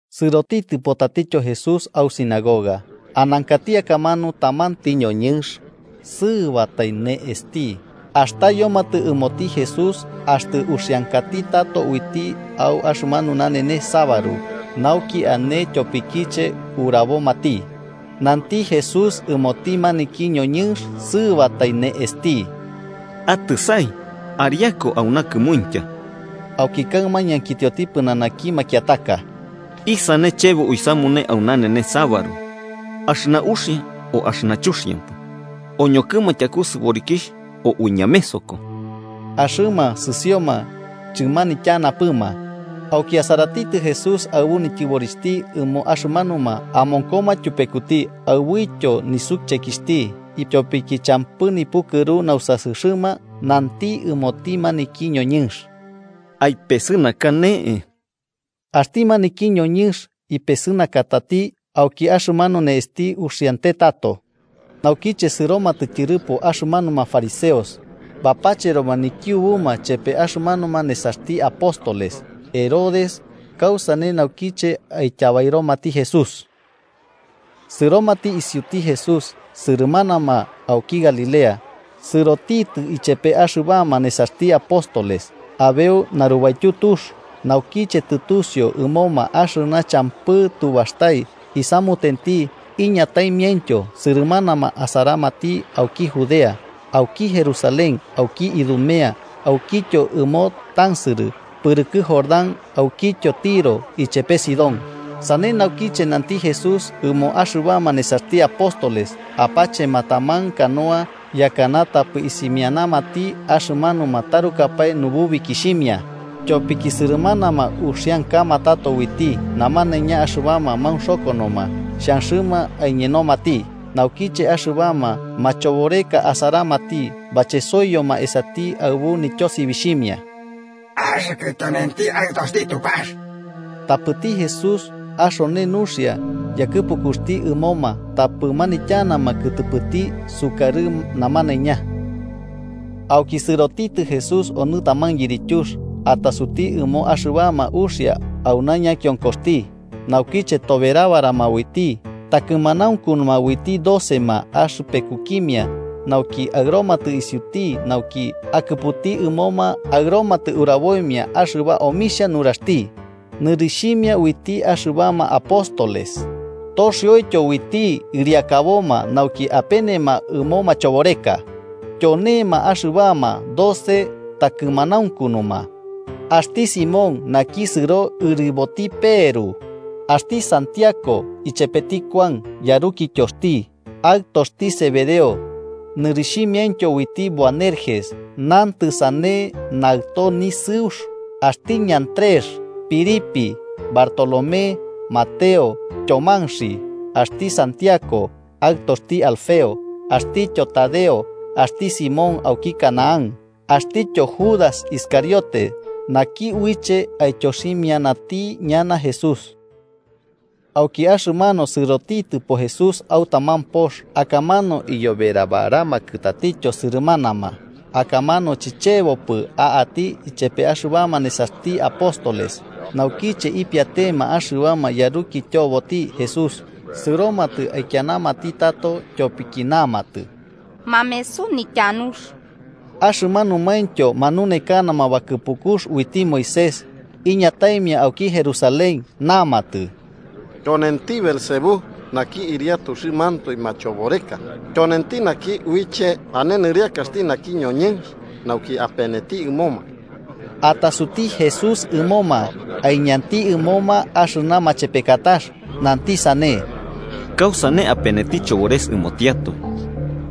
Sɨrotitɨpo tatityo Jesús au sinagoga. Anankati akamanu tamanti ñoñɨnx sɨɨbatai ne'esti. Astayomatɨ ɨmoti Jesús axtɨ uxiankati tato uiti au axɨmanu nanenes sabaru, nauki ane tyopikiche urabomati. Nanti Jesús ɨmoti maniki ñoñɨnx sɨɨbatai ne'esti: –Atɨsai ariaku auna kɨmuintya. Auki kaɨma ñankitioti pɨnanaki makiataka: –¿Isane chebo uisamune au nanenes sabaru: axɨna uxia o axɨna chuxiampɨ? ¿Oñokɨma tyaku sɨborikixh o uiñamesoko? Axɨma sɨsioma chɨmanityanapɨma. Auki asaratitɨ Jesús aɨbu nityɨborixhti ɨmo axɨmanuma amonkoma tyupekuti, aɨbuityo nisuchekixhti ityopiki champɨ nipukɨru nausasɨxɨma nanti ɨmoti maniki ñoñɨnx: –Aipesɨnaka ne'e. Axti maniki ñoñɨnx ipesɨnakatati, auki axɨmanu ne'esti uxiante tato. Naukiche sɨromatɨ tyɨrɨpo axɨmanuma fariseos, bapacheroma nikiubuma chepe axɨmanuma nesaxti apóstoles Herodes kausane naukiche aityabairomati Jesús. Sɨromatɨ isiuti Jesús, sɨrɨmanama auki Galilea, sɨrotitɨ ichepe axɨbama nesaxti apóstoles abeu narubaityu tux. Naukiche tɨtusiu ɨmoma axɨna champɨ tubastai isamutenti, iñataimiaintyo sɨrɨmanama asaramati auki Judea, auki Jerusalén, auki Idumea, aukityo ɨmo tansɨrɨ pɨrɨkɨ Jordán aukityo Tiro ichepe Sidón. Sane naukiche, nanti Jesús ɨmo axɨbama nesaxti apóstoles apachema taman canoa, yakɨna tapɨ isimianamati axɨmanuma tarukapae nububikixhimia. Tyopiki sɨrɨmanama uxiankama tato uiti, namanaiña axɨbama maunxokonoma xhanxɨma aiñenomati. Naukiche axɨbama machoboreka asaramati, bachesoiyoma esati aɨbu nityosibixhimia: –¡Axɨkɨ tyonenti Aɨtoxti Tupax! Tapɨti Jesús axone nuxia yakɨpukuxti ɨmoma tapɨ manityanama kɨtɨpɨti sukarɨ namanaiña. Auki sɨrotitɨ Jesús onɨ taman yirityux, atasuti ɨmo axɨbama uxia auna ñakionkoxti. Naukiche toberabarama uiti, takɨmanaunkunuma uiti docema axɨpekukimia, nauki aɨromatɨ isiuti nauki akɨputi ɨmoma aɨromatɨ uraboimia axɨba omixhia nuraxti. Nɨrixhimia uiti axɨbama apóstoles, toxioityo uiti ɨriakaboma nauki apenema ɨmo machoboreka. Tyonema axɨbama doce takɨmanaunkunuma: Axti Simón, naki sɨro ɨriboti Peru. Axti Santiago ichepeti Kuan yarukityoxti, aɨtoxti Zebedeo, nɨrixhimiaintyo uiti Boanerges, (nantɨ sane, “Naɨto Nisɨux.”) Axti Andrés, Felipe, Bartolomé, Mateo, Tyomanxi axtityo Santiago, aɨtoxti Alfeo. Axtityo Tadeo, axti Simón auki Canaán, axtityo Judas Iscariote, naki uiche aityoximianati ñana Jesús. Auki axɨmanu sɨrotitɨpo Jesús au taman pox, akamanu iyoberabaramakɨ tatityo sɨrɨmanama, akamanu chichebopɨ a'ati ichepe axɨbama nesaxti apóstoles. Naukiche ipiatema axɨbama yarukityoboti Jesús, sɨromatɨ aikianamati tato, tyopiki namatɨ, mameso nityanuxti. Axɨmanumaintyo manunekanama bakɨpukux uiti Moisés iñataimia auki Jerusalén namatɨ: “Tyonenti Beelzebú, naki ɨriatuxɨmantoe machoboreka, tyonenti naki uiche ane nɨrɨakaxti naki ñoñɨnx nauki apeneti ɨmoma.” Atasuti Jesús ɨmoma, aiñanti ɨmoma axɨna machepekatax, nanti sane: “¿Kausane apeneti Chobores ɨmotiatoe?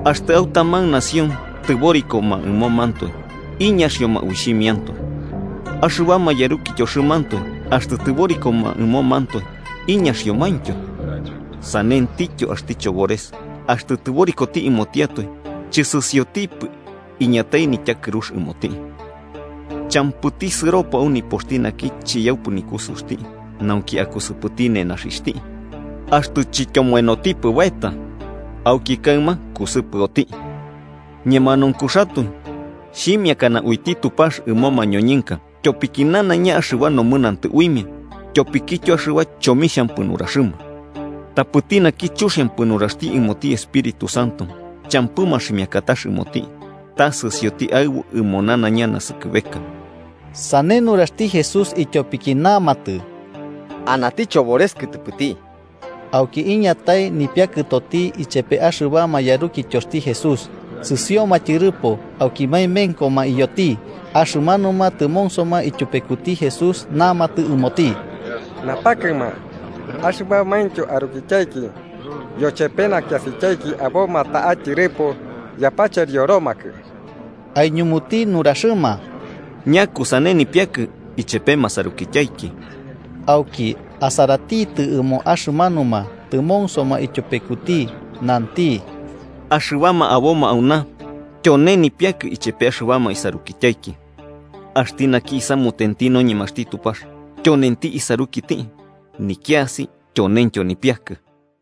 Axtɨ au taman nación tɨborikoma ɨmomantoe, iñaxioma uixhimiantoe. Axɨbama yarukityoxɨmantoe, axtɨ tɨborikoma ɨmomantoe, iñaxiomaintyo. Sanentityo, Axti Chobores axtɨ tɨborikoti ɨmotiatoe, chɨsɨsiotipɨ iñatai nityakɨrux ɨmoti. “Champɨti sɨropo au nipoxti naki chiyaupɨ nikusɨuxti nauki akusɨpɨti nenaxixhti, axtɨ chityomoenotipɨ baeta. Auki kaɨma kusɨpɨoti. “Ñemanaunkuxatoe xhimiakana uiti Tupax ɨmo mañoñɨnka tyopiki nanaiña axɨba nomɨnantɨ uimia tyopikityo axɨba chomixhampɨ nuraxɨma: tapɨti naki chuxiampɨ nuraxti ɨmoti Espíritu Santo, champɨ maximiakatax ɨmoti, ta sɨsioti aɨbu ɨmo nanaiña naskɨbeka.” Sane nuraxti Jesús ityopiki namatɨ ta anati chobores kɨtɨpɨti. Auki iñatai nipiakɨtoti ichepe axɨbama yarukityoxti Jesús, sɨsioma tyɨrɨpo auki maemenkoma iyoti. Axɨmanuma tɨmonsoma ityupekuti Jesús namatɨ ɨmoti: –Napakɨma, axɨbamaintyo arukityaiki yochepe nakiasityaiki aboma ta'a tyɨrɨpo, yapacherioromakɨ. Aiñumuti nuraxɨma: –¿Ñakusane nipiakɨ ichepe masarukityaiki? Auki, asaratitɨ ɨmo axɨmanuma tɨmonsoma ityupekuti, nanti: –Axɨbama aboma auna, tyone nipiakɨ ichepe axɨbama isarukityaiki. Axti naki isamutenti noñemaxti Tupax, tyonenti isarukiti, nikiasi tyonentyo nipiakɨ.